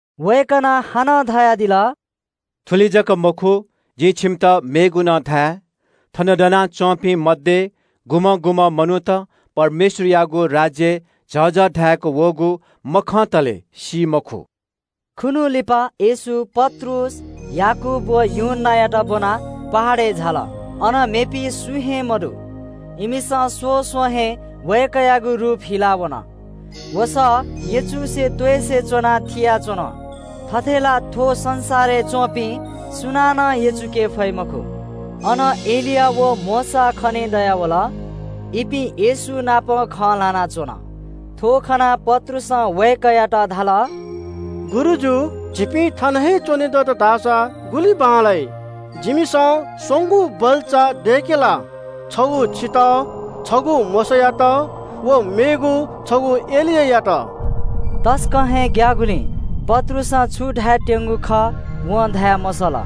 वय्‌कलं हानं धयादिल – “थुलि जक मखु, जिं छिमित मेगु नं धाये – थन दनाच्‍वंपिं मध्‍ये गुम्‍हं गुम्‍हं मनूत परमेश्‍वरयागु राज्‍य झःझः धाय्‌क वःगु मखंतले सी मखु।” खुन्‍हु लिपा येशू पत्रुस, याकूब व यूहन्‍नायात ब्‍वनाः पहाडय् झाल। अन मेपिं सुं हे मदु। इमिसं स्‍वस्‍वं हे वय्‌कःयागु रूप हिला वन। वसः यचुसे त्‍वइसे च्‍वनाः थिनाच्‍वन, थथे ला थ्‍व संसारय् च्‍वंपिं सुनानं यचुके फइ मखु। अन एलिया व मोशा खनेदयावल। इपिं येशू नाप खँ ल्‍हानाच्‍वन। थ्‍व खनाः पत्रुसं वय्‌कःयात धाल – “गुरुजु, झीपिं थन हे च्‍वने दत धाःसा गुलि बांलाइ। जिमिसं स्‍वंगू बल्‍चा दय्‌के ला। छगू छितः, छगू मोशायात व मेगु छगू एलियायात।” इपिं तसकं हे ग्‍याःगुलिं पत्रुसं छु धायेत्‍यंगु खः वं धाये मसल।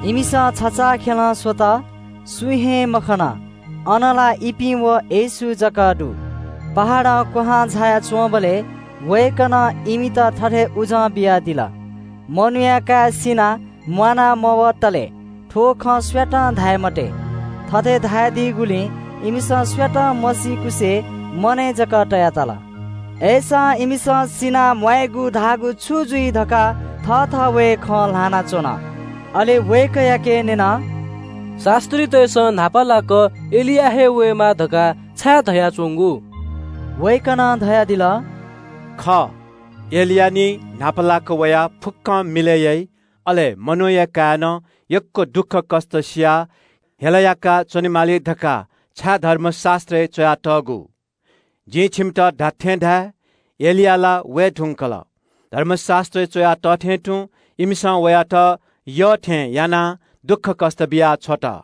इमिसं छचाःखेलं स्‍वल, सुं हे मखन, अन ला इपिं व येशू जक दु। पहाडं क्‍वहां झाया च्‍वंबलय् वय्‌कलं इमित थथे उजं बियादिल – “मनूया काय् सिनाः म्‍वाना मवतलय् थ्‍व खँ सुयातं धाये मते।” थथे धयादीगुलिं इमिसं सुयातं मसीकुसे मनय् जक तया तल। अय्‌सां इमिसं सिनाः म्‍वायेगु धाःगु छु जुइ धकाः थःथवय् खँ ल्‍हानाच्‍वन। अले वय्‌कःयाके न्‍यन – “शास्‍त्रीतय्‌सं न्‍हापालाक एलिया हे वयेमाः धकाः छाय् धयाच्‍वंगु?” वय्‌कलं धयादिल – “खः, एलिया निं न्‍हापालाक वयाः फुक्‍कं मिलय् याइ। मनूया काय्‌नं यक्‍व दुःखकष्‍ट सियाः हेला याका च्‍वनेमाली धकाः छाय् धर्मशास्‍त्रय् च्‍वयातःगु? जिं छिमित धात्‍थें धाये – एलिया ला वये धुंकल। धर्मशास्‍त्रय् च्‍वया तः थें तुं इमिसं वयात यःथें यानाः दुःखकष्‍ट बियाछ्वत।”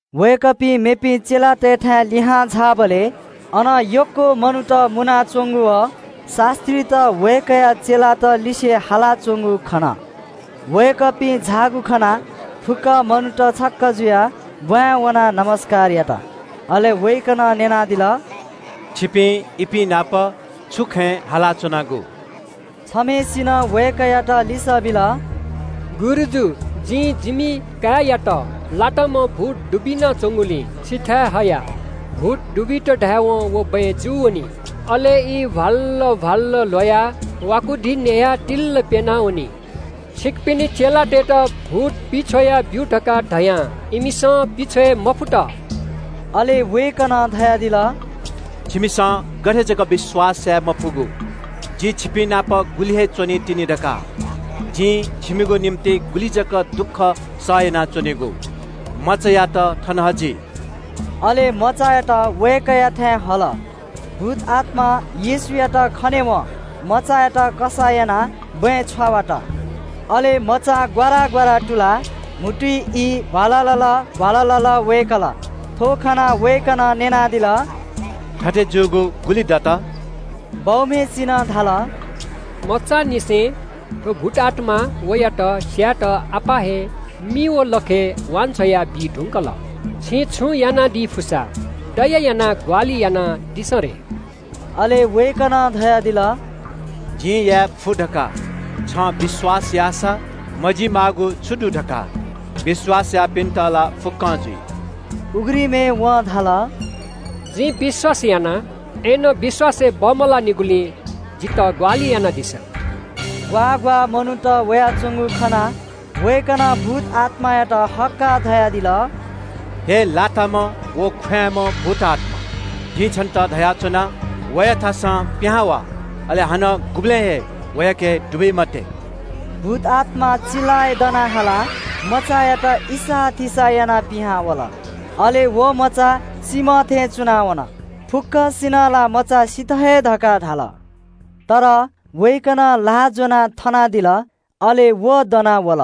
वय्‌कःपिं मेपिं चेलातय्‌थाय् लिहां झाःबलय् अन यक्‍व मनूत मुनाच्‍वंगु व शास्‍त्रीत वय्‌कःया चेलात लिसे हालाच्‍वंगु खन। वय्‌कःपिं झाःगु खनाः फुक्‍क मनूत छक्‍क जुयाः ब्‍वाँय् वनाः लसकुस यात। अले वय्‌कलं न्‍यनादिल – “छिपिं इपिं नाप छु खँय् हालाच्‍वनागु?” छम्‍हय्‌सिनं वय्‌कःयात लिसः बिल – “गुरुजु, जिं जिमि काय्‌यात लाताम्‍ह भूत दुबिना च्‍वंगुलिं छिथाय् हया। भूत दुबित धायेवं व बँय् जू वनी, अले ई भ्‍वाललल भ्‍वाललल ल्‍ह्वयाः वाकुधी न्‍ह्ययाः तिल्‍ल प्‍यना वनी। छिकपिनि चेलातय्‌त भूत पिछ्वया ब्‍यु धकाः धयां इमिसं पिछ्वये मफुत।” अले वय्‌कलं धयादिल – “छिमिसं गथे जक विश्‍वास याये मफुगु? जि छिपिंनाप गुलि हे च्‍वनीतिनि धकाः? जिं छिमिगु निंतिं गुलि जक दुःख सह यानाच्‍वनेगु? मचायात थन हजि।” अले मचायात वय्‌कःयाथाय् हल। भूतआत्‍मां येशूयात खनेवं मचायात कसाः यानाः बँय् छ्वावात। अले मचां ग्‍वारा ग्‍वारा तुलाः म्‍हुतुइ ई भ्‍वाललल भ्‍वाललल वय्‌कल। थ्‍व खनाः वय्‌कलं न्‍यनादिल – “थथे जूगु गुलि दत?” बौम्‍हय्‌सिनं धाल – “मचांनिसें। थ्‍व भूतआत्‍मां वयात स्‍यायेत अप्‍वः हे मिइ व लखय् वान्‍छ्वया बी धुंकल। छिं छुं यानादी फुसा, दया यानाः ग्‍वाहालि यानादिसँ रे।” अले वय्‌कलं धयादिल – “जिं याये फु धकाः छं विश्‍वास याःसा मजी माःगु छु दु धकाः? विश्‍वास याःपिन्‍त ला फुक्‍कं जुइ।” उघ्रिमय् वं धाल – “जिं विश्‍वास याना, अय्‌नं विश्‍वासय् बमलाःनिगुलिं जितः ग्‍वाहालि यानादिसँ।” ग्‍वाः ग्‍वाः मनूत वयाच्‍वंगु खनाः वय्‌कलं भूतआत्‍मायात हक्‍काः धयादिल – “हे लाताम्‍ह व ख्‍वाँय्‌म्‍ह भूतआत्‍मा, जिं छन्‍त धयाच्‍वना – वयाथासं पिहां वा, अले हानं गुबलें हे वयाके दुबी मते।” भूतआत्‍मा चिल्‍लाय् दना हालाः मचायात इसाःथिसाः यानाः पिहां वल। अले व मचा सीम्‍ह थें च्‍वना वन। फुक्‍कसिनं ला मचा सित हे धकाः धाल। तर वय्‌कलं ल्‍हाः ज्‍वनाः थनादिल, अले व दना वल।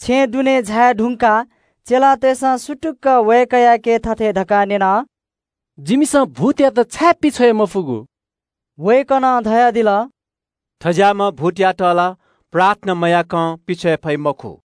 छेँय् दुने झाये धुंकाः चेलातय्‌सं सुतुक्‍क वय्‌कःयाके थथे धकाः न्‍यन – “जिमिसं भूतयात छाय् पिछ्वये मफुगु?” वय्‌कलं धयादिल – “थज्‍याःम्‍ह भूतयात ला प्रार्थना मयाय्‌कं पिछ्वये फइ मखु।”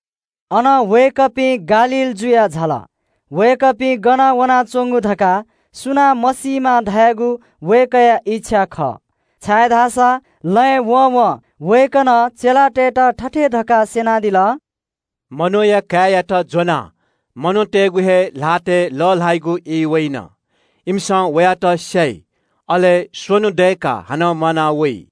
अनं वय्‌कःपिं गालील जुयाः झाल। वय्‌कःपिं गन वनाच्‍वंगु धकाः सुनां मसीमा धयागु वय्‌कःया इच्‍छा खः। छाय्‌धाःसा लँय् वँवं वय्‌कलं चेलातय्‌त थथे धकाः स्‍यनादिल – “मनूया काय्‌यात ज्‍वनाः मनूतय्‌गु हे ल्‍हातय् लः ल्‍हाइगु ई वइन। इमिसं वयात स्‍याइ, अले स्‍वन्‍हु दय्‌काः हानं म्‍वाना वइ।”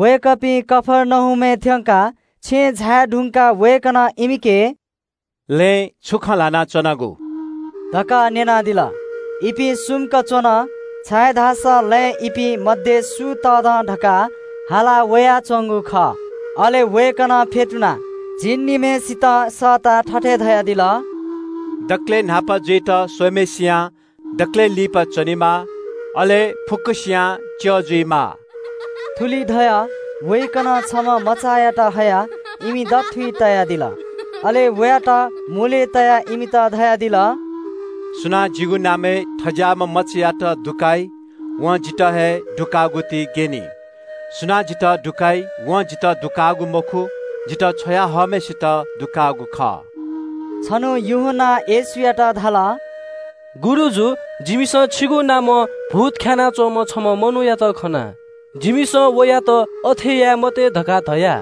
वय्‌कःपिं कफर्नहुमय् थ्‍यंकाः छेँय् झाये धुंकाः वय्‌कलं इमिके “लँय् छु खँ ल्‍हाना च्‍वनागु?” धकाः न्‍यनादिल। इपिं सुम्‍क च्‍वन, छाय्‌धाःसा लँय् इपिं मध्‍ये सु तःधं धकाः हाला वयाच्‍वंगु खः। अले वय्‌कलं फ्‍यतुनाः झिंनिम्‍हय्‌सितं सःताः थथे धयादिल – “दकलय् न्‍हापा जुइत स्‍वइम्‍हय्‌सियां दकलय् लिपा च्‍वनेमाः, अले फुक्‍कसियां च्‍यः जुइमाः।” थुलि धयाः वय्‌कलं छम्‍ह मचायात हयाः इमि दथुइ तयादिल। अले वयात मुलय् तयाः इमित धयादिल – “सुनां जिगु नामय् थज्‍याःम्‍ह मचायात लसकुस याइ, वं जितः हे लसकुस याःगुति ग्‍यनी। सुनां जितः लसकुस याइ वं जितः लसकुस याःगु मखु, जितः छ्वया हःम्‍हय्‌सित लसकुस याःगु खः।” छन्‍हु यूहन्‍नां येशूयात धाल – “गुरुजु, जिमिसं छिगु नामं भूत ख्‍यानाः च्‍वंम्‍ह छम्‍ह मनूयात खना। जिमिसं वयात अथे याये मते धकाः धया,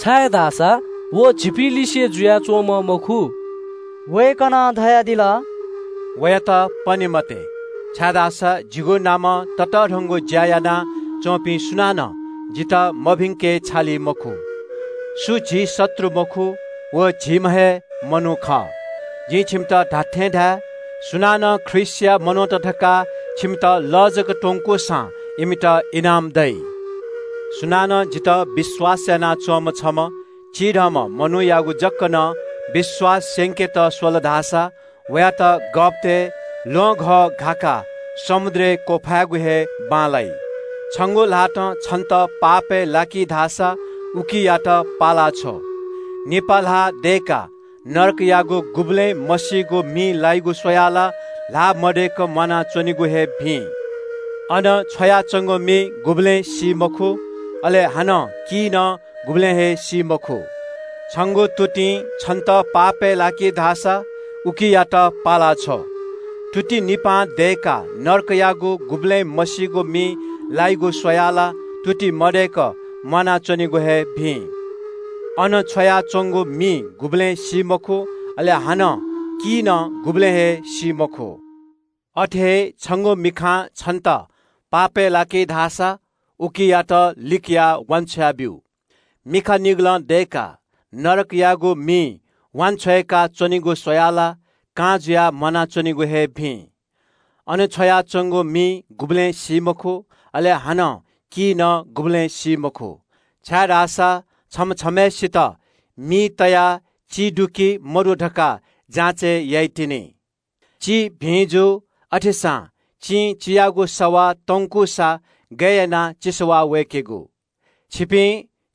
छाय्‌धाःसा व झीपिंलिसे जुयाच्‍वंम्‍ह मखु।” वय्‌कलं धयादिल – “वयात पने मते, छाय्‌धाःसा जिगु नामं ततःधंगु ज्‍या यानाच्‍वंपिं सुनानं जितः मभिंके छालि मखु। सु झी शत्रु मखु, व झीम्‍ह हे मनू खः। जिं छिमित धात्‍थें धाये – सुनानं ख्रीष्‍टया मनूत धकाः छिमित लः जक त्‍वंकूसां वयात इनाम दइ।” “सुनानं जितः विश्‍वास यानाच्‍वंम्‍ह छम्‍ह चिधंम्‍ह मनूयागु जक नं विश्‍वास स्‍यंकेत स्‍वल धाःसा वयात गःपतय् ल्‍वहंघः घाकाः समुद्रय् वांछ्वयेगु हे बांलाइ। छंगु ल्‍हातं छन्‍त पापय् लाकी धाःसा उकियात पाला छ्व। निपा ल्‍हाः दय्‌काः नरकयागु गुबलें मसीगु मिइ लाय्‌गु स्‍वयाः ला ल्‍हाः मदय्‌क म्‍वानाच्‍वनेगु हे भिं। अन छ्वयाच्‍वंगु मि गुबलें सी मखु, अले हानं की नं गुबलें हे सी मखु। छंगु तुतिं छन्‍त पापय् लाकी धाःसा उकियात पाला छ्व। तुति निपा दय्‌काः नरकयागु गुबलें मसीगु मिइ लायेगु स्‍वयाः ला तुति मदय्‌क म्‍वानाच्‍वनेगु हे भिं। अन छ्वयाच्‍वंगु मि गुबलें सी मखु, अले हानं की नं गुबलें हे सी मखु। अथे हे छंगु मिखां छन्‍त पापय् लाकी धाःसा उकियात लिकयाः वान्‍छ्वया ब्‍यु। मिखा निगलं मदयेका नरकयागु मिइ वांछ्वय्‌का च्‍वनेगु स्‍वयाः ला छंगु लागि कां जुयाः परमेश्‍वरयागु राज्‍यलय् दुहां वनेगु हे भिं। अन छ्वयाच्‍वंगु मि गुबलें सी मखु, अले हानं की नं गुबलें सी मखु। “छम्‍ह छम्‍हय्‌सित मिं हे चि सवाः वय्‌की। चि भिं जू, अथेसां चिं चियागु सवाः तंकूसा गय् यानाः चि सवाः वय्‌केगु? छिपिं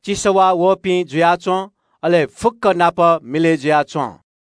चि सवाः वःपिं जुयाच्‍वँ, अले फुक्‍क नाप मिलय् जुयाच्‍वँ।”